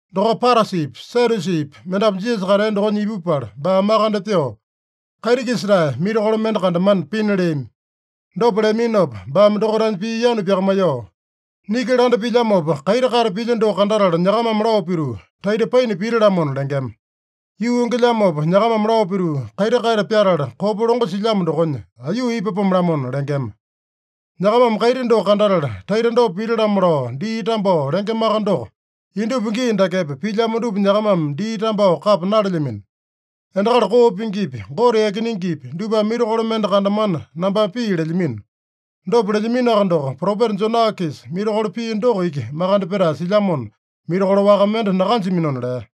Dokopa Parasipi, Sadyusipi mendapu Jisasa katea dokonya ipupala, baa makande pyoo, kaiti-kisa-tae mirakolo mende kandamana pina leami. Dopa leaminopa baame dokaitanya pii yanu pyakamaiyoo, “Niki landa pilyamopa, kaiti kate pilya doko kandatala nyakamame lao pituu, ‘Taita paina pita-lamona’ lengema. Yuu yongelyamopa, nyakamame lao pituu, ‘Kaiti kate pyatala kopa longo silyamo dokonya, aiyuu ipapome-lamona’ lengema. Nyakamame kaiti doko kandatala, taita dopa pita-lamo lao dii tambao lengemaka doko, indupa gii dakepa pilyamo dupa nyakamame dii tambao kapa nalelyamino. Endakali koo pingipi, Gote yakinengepi dupame mirakolo mende kandamana nambame pii lelyamino. Dopa lelyaminoaka doko, propeta Jona-kisa mirakolo pia doko iki makande petae silyamona, mirakolo waka mende nakanjaminona” lea.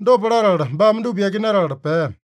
Dopa latala baame dupa yakinatala pea.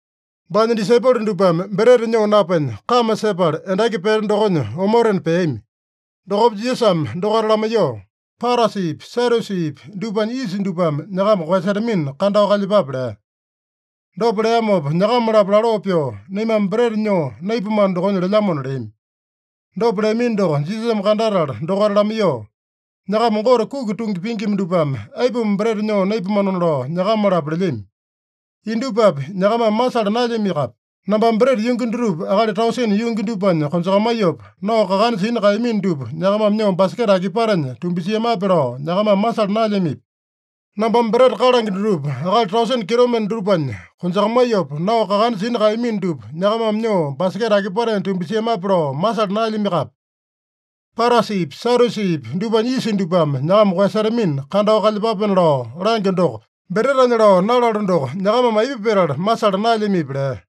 Baanya disaipolo dupame breta nyoo napenya, kame sepala endaki pete dokonya omotena peami. Dokopa Jisasame dokaita lamaiyoo, “Parasipi, Sadyusipi dupanya yisa dupame nyakama koeyasetamina, kandao kalyepape” lea. Dopa leamopa nyakama-lapo laloo pyoo, “Naimame breta nyoo naipamano dokonya lelyamona” leami. Dopa leamino doko Jisasame kandatala dokaita lamaiyoo, “Nyakama Gote kuki tungi pingima dupame, aipuma breta nyoo naipamanona lao nyakama-lapo lelyami? Indupapi nyakamame masala naelyamiakape? Nambame breta yungi dutupa akali tausene yungi dupanya konjakamaiyopa, nao kakana sina kaeyamino dupa nyakamame nyoo baseketa akipatenya tumbasiamape lao nyakamame masala naelyamipi? Nambame breta kalange dutupa akali tausene kitomende dupanya konjakamaiyopa, nao kakana sina kaeyamino dupa nyakamame nyoo baseketa akipatenya tumbasiamape lao masala naelyamiakape? Parasipi, Sadyusipi dupanya yisa dupame nyakama koeyasetamina kandao kalyepapena lao langyo doko, bretanya lao nalalo doko, nyakamame aipa petala masala naelyamipi?” lea.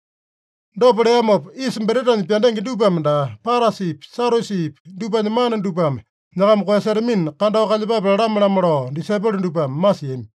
Dopa leamopa, yisa bretanya pyandenge dupame daa, Parasipi, Sadyusipi dupanya mana dupame nyakama koeyasetamina kandao kalyepape lalame-lamo lao disaipolo dupame masiami.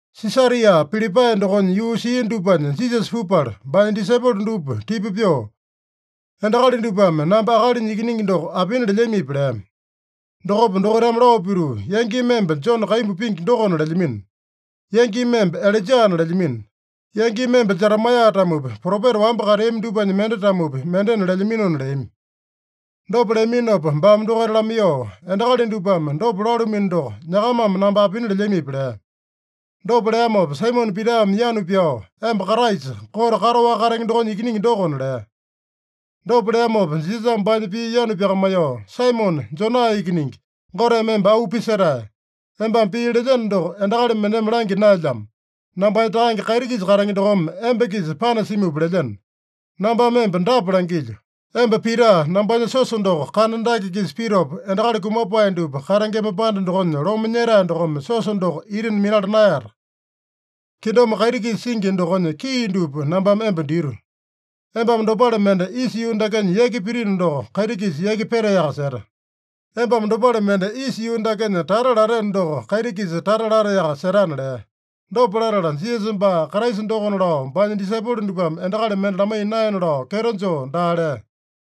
Sisaria Pilipae dokonya yuu sia dupanya Jisasa pupala, baanya disaipolo dupa tipa pyoo, “Endakali dupame namba Akalinya Ikiningi doko apina lelyamipi?” lea. Dokopa dokaitame lao pituu, “Yangimi emba Jone kaimbu pingi dokona lelyamino. Yangimi emba Ilaijana lelyamino. Yangimi emba Jeremaeya-tamopi, propeta wamba kateami dupanya mende-tamopi, mendena lelyaminona” leami. Dopa leaminopa baame dokaita lamaiyoo, “Endakali dupame dopa lalumino doko, nyakamame namba apina lelyamipi?” lea. Dopa leamopa Saimone Pitame yanu pyao, “Emba Kraisa, Gote kataowaka katenge dokonya Ikiningi dokona” lea. Dopa leamopa Jisasame baanya pii yanu pyakamaiyoo, “Saimone, Jona ikiningi, Goteme emba auu pisetae. Embame pii lelyeno doko, endakali mendeme langya naelyamo. Nambanya Takange kaiti-kisa katenge dokome emba-kisa panasimupa lelyeno. Nambame emba dapa langilyo: Emba Pita. Nambanya siosa doko kana dake-kisa pitopa, endakali kumapae dupa katengema panda dokonya lome nyetae dokome siosa doko ita minala naeyata. Kingdom kaiti-kisa singi dokonya kii dupa nambame emba dito. Embame dopale mende isa yuu dakenya yaki pitino doko, kaiti-kisa yaki petaeyaka seta. Embame dopale mende isa yuu dakenya tata lateno doko, kaiti-kisa tata lataeyaka setana” lea. Dopa latala, Jisasa baa Kraisa dokona lao baanya disaipolo dupame endakali mende lamaiya naena lao kyeto joo daa lea.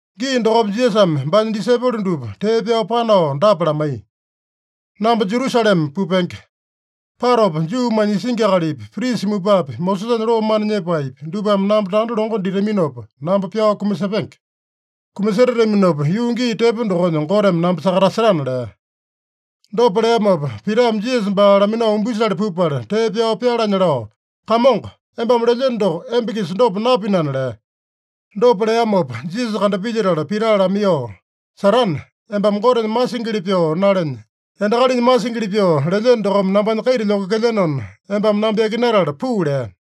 Gii dokopa Jisasame baanya disaipolo dupa tee pyao panao dapa lamaiya: “Namba Jerusalema pupenge. Patopa Juumanya isingi akalipi, prisa mupapi, Mosesanya loo mana nyepaepi, dupame namba tanda longo ditaminopa namba pyao kumasepenge. Kumasetataminopa, yuu gii tepo dokonya Goteme namba sakatasetana” lea. Dopa leamopa, Pitame Jisasa baa laminao umbisale pupala, tee pyao pyalanya lao, “Kamongo, embame lelyeno doko emba-kisa dopa napinana” lea. Dopa leamopa Jisasa kandapilyetala Pita lamaiyoo, “Satane, embame Gotenya masingili pyoo nalenya, endakalinya masingili pyoo lelyeno dokome nambanya kaita lyokekelyenona, embame namba yakinatala puu” lea.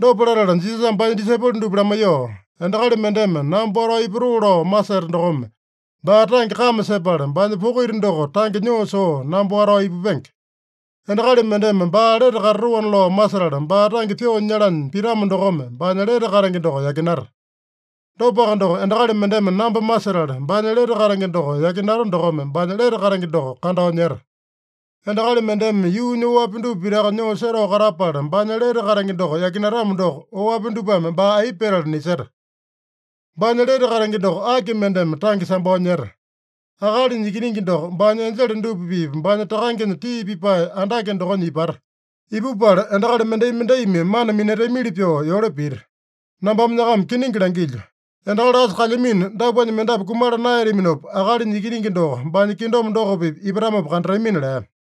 Dopa latala Jisasame baanya disaipolo dupa lamaiyoo, “Endakali mendeme namba watao ipatoo lao maseta dokome baa tange kame sepala, baanya poko ita doko tange nyoo soo namba watao ipupenge. Endakali mendeme baa lete katatoana lao masetala, baa tange pyoo nyalanya pitamo dokome baanya lete katenge doko yakinata. Dopaka doko, endakali mendeme namba masetala, baanya lete katenge doko yakinata dokome baanya lete katenge doko kandao nyeta. Endakali mendeme yuunya oapi dupa pitaka nyoo setao katapala, baanya lete katenge doko yakinatamo doko, oapi dupame baa aipa petala niseta? Baanya lete katenge doko aki mendeme tange sambao nyeta? Akalinya Ikiningi doko baanya enjele dupa-pipa, baanya Takangenya tii pipae andake dokonya ipata. Ipupala endakali mendai-mendaimi mana minatamili pyoo yole pita. Nambame nyakama kiningi langilyo: Endakali asa kalyamino dapuanya mendapu kumala naeyataminopa, Akalinya Ikiningi doko baanya kingdom doko-pipa ipatamopa kandatamina” lea.